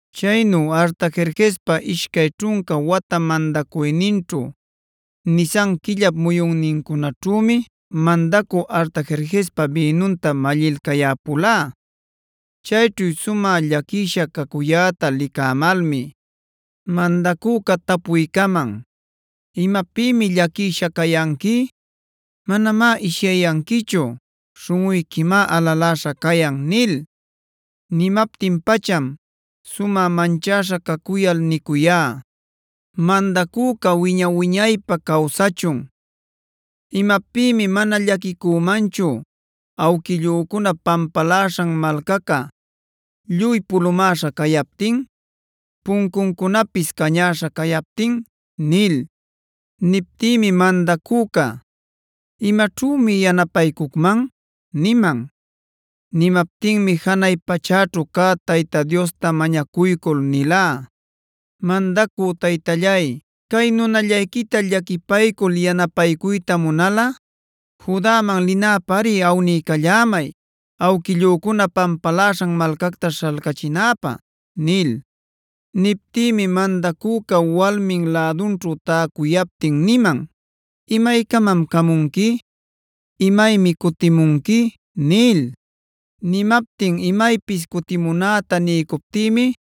Chaynu Artajerjespa ishcay ćhunca wata mandacuyninćhu Nisan quillap muyunnincunaćhümi mandacü Artajerjespa bïnunta mallilcayäpulá. Chayćhu sumä llaquisha cacuyäta licämalmi, mandacüca tapuycaman: “¿Imapïmi llaquisha cayanqui? Manamá ishyayanquichu. Śhunꞌuyquimá alaläśha cayan” nil. Nimaptin-pacham sumä manchäśha cacuyal nicuyá: “¡Mandacüca wiña-wiñaypä cawsachun! ¿Imapïmi mana llaquicümanchu awquillücunap pampaläśhan malcaca lluy pulumäśha cayaptin, puncuncunapis cañäśha cayaptin?” Niptïmi mandacüca: “¿Imaćhümi yanapaycucman?” niman. Nimaptinmi janay pachäćhu cä Tayta Diosta mañacuycul nilá: “Mandacü taytallay, cay nunallayquita llaquipaycul yanapaycuyta munalꞌa Judaman linäpäri awniycallämay awquillücuna pampaläśhan malcacta śhalcachinäpä” nil. Niptïmi mandacüca walmin lädunćhu täcuyaptin niman: “¿Imaycamam camunqui? ¿Imaymi cutimunqui?” nil. Nimaptin imaypis cutimunäta niycuptïmi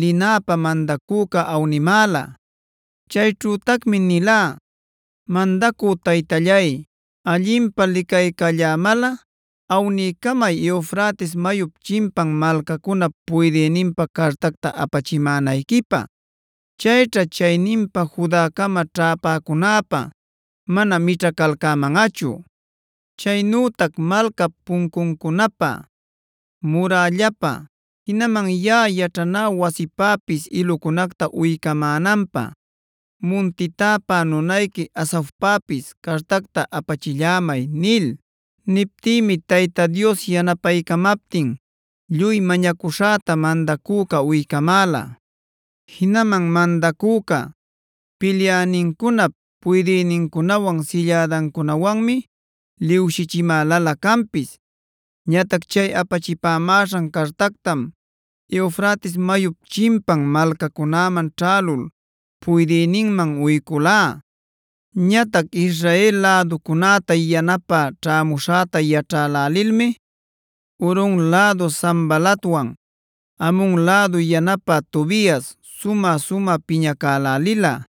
linäpä mandacüca awnimäla. Chayćhütacmi nilá: “Mandacü taytallay, allinpä licaycallämalꞌa awniycamay Eufrates mayup chimpan malcacunap puydïninpä cartacta apachimänayquipä; chayćha chayninpa Judacama ćhäpäcunäpä mana mićhacalcämanꞌachu. Chaynütac malcap puncuncunapä, murällapä, jinaman yaꞌa yaćhanä wasipäpis ilucunacta uycamänanpä munti täpä nunayqui Asafpäpis cartacta apachillämay” nil. Niptïmi Tayta Dios yanapaycamaptin lluy mañacuśhäta mandacüca uycamäla. Jinaman mandacüca pilyänincunap puydïnincunawan sillädancunawanmi liwshichimälalä canpis. Ñatac chay apachimäśhan cartactam Eufrates mayup chimpan malcacunaman ćhälul puydïninman uyculá. Ñatac Israel läducunäta yanapä ćhämuśhäta yaćhälälilmi Horon lädu Sanbalatwan Amon lädu yanapä Tobias sumä-sumä piñacälälila.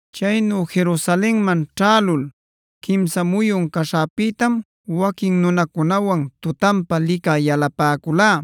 Chaynu Jerusalenman ćhälul quimsa muyun caśhäpïtam waquin nunacunawan tutanpa licä yalapäculá.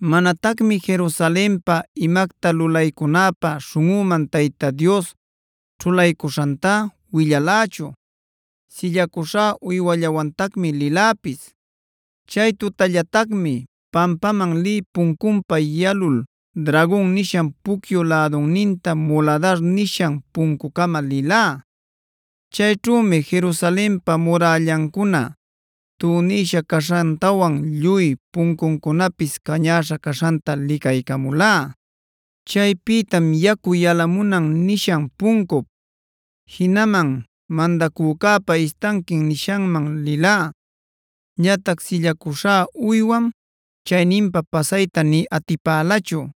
Manatacmi Jerusalenpä imacta lulaycunäpä śhunꞌüman Tayta Dios ćhulaycuśhantá willalächu. Sillacuśhá uywallawantacmi liläpis. Chay tutallatacmi pampaman lï puncunpa yalul Dragon nishan pucyu lädunninta Muladarb nishan puncucama lilá. Chayćhümi Jerusalenpa murällancuna tunïsha caśhantawan lluy puncuncunapis cañäśha caśhanta licaycamulá. Chaypïtam Yacu Yalamunan nishan puncup, jinaman Mandacücäpa Istanquin nishanman lilá. Ñatac sillacuśhá uywam chayninpa pasayta nï atipälachu.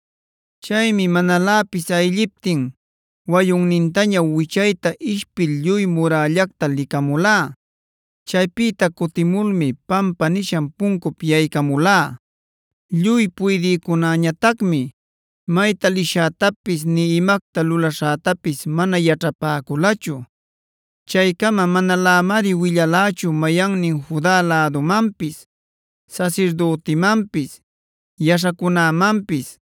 Chaymi manaläpis aylliptin wayunnintaña wichayta ishpil lluy murällacta licamulá. Chaypïta cutimulmi Pampa nishan puncup yaycamulá. Lluy puydïcunäñatacmi mayta lishätapis nï imacta lulaśhätapis mana yaćhapäculachu. Chaycama manalämari willalächu mayannin Juda lädumanpis, sasirdütimanpis, yaśhacunämanpis,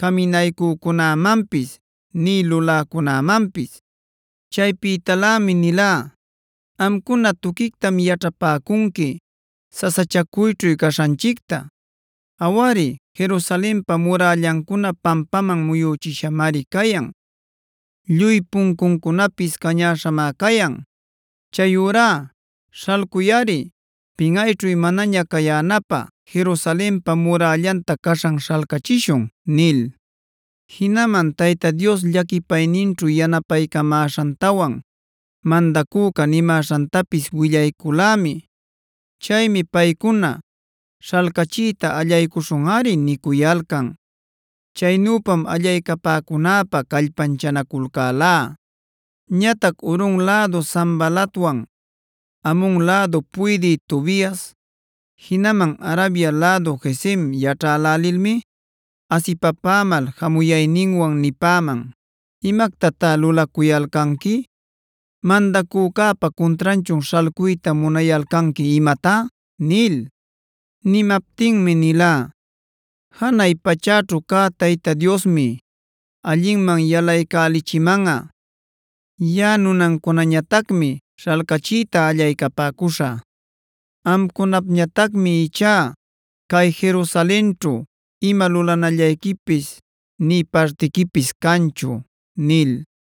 caminaycücunämanpis nï luläcunämanpis. Chaypïtalämi nilá: “Amcuna tuquictam yaćhapäcunqui sasachacuyćhu caśhanchicta. Awari Jerusalenpa murällancuna pampaman muyüchishamari cayan; lluy puncuncunapis cañäśhamá cayan. Chayurá śhalculꞌari pinꞌayćhu manaña cayänapä Jerusalenpa murällanta caśhan śhalcachishun” nil. Jinaman Tayta Dios llaquipayninćhu yanapaycamäśhantawan mandacüca nimäśhantapis willayculämi. Chaymi paycuna: “Śhalcachiyta allaycuśhunꞌari” nicuyalcan. Chaynüpam allaycapäcunäpä callpanchanaculcälá. Ñatac Horon lädu Sanbalatwan Amon lädu puydï Tobias, jinaman Arabia lädu Gesem yaćhälälilmi asipapämal jamuyayninwan nipäman: “¿Imactatá lulacuyalcanqui? ¿Mandacücäpa cuntranchun śhalcuyta munayalcanqui imatá?” nil. Nimaptinmi nilá: “Janay pachäćhu cä Tayta Diosmi allinman yalaycälichimanꞌa. Yaꞌa nunancunañatacmi śhalcachiyta allaycapäcuśhä. Amcunapñatacmi ichá cay Jerusalenćhu ima lulanallayquipis, nï partiquipis canchu” nil.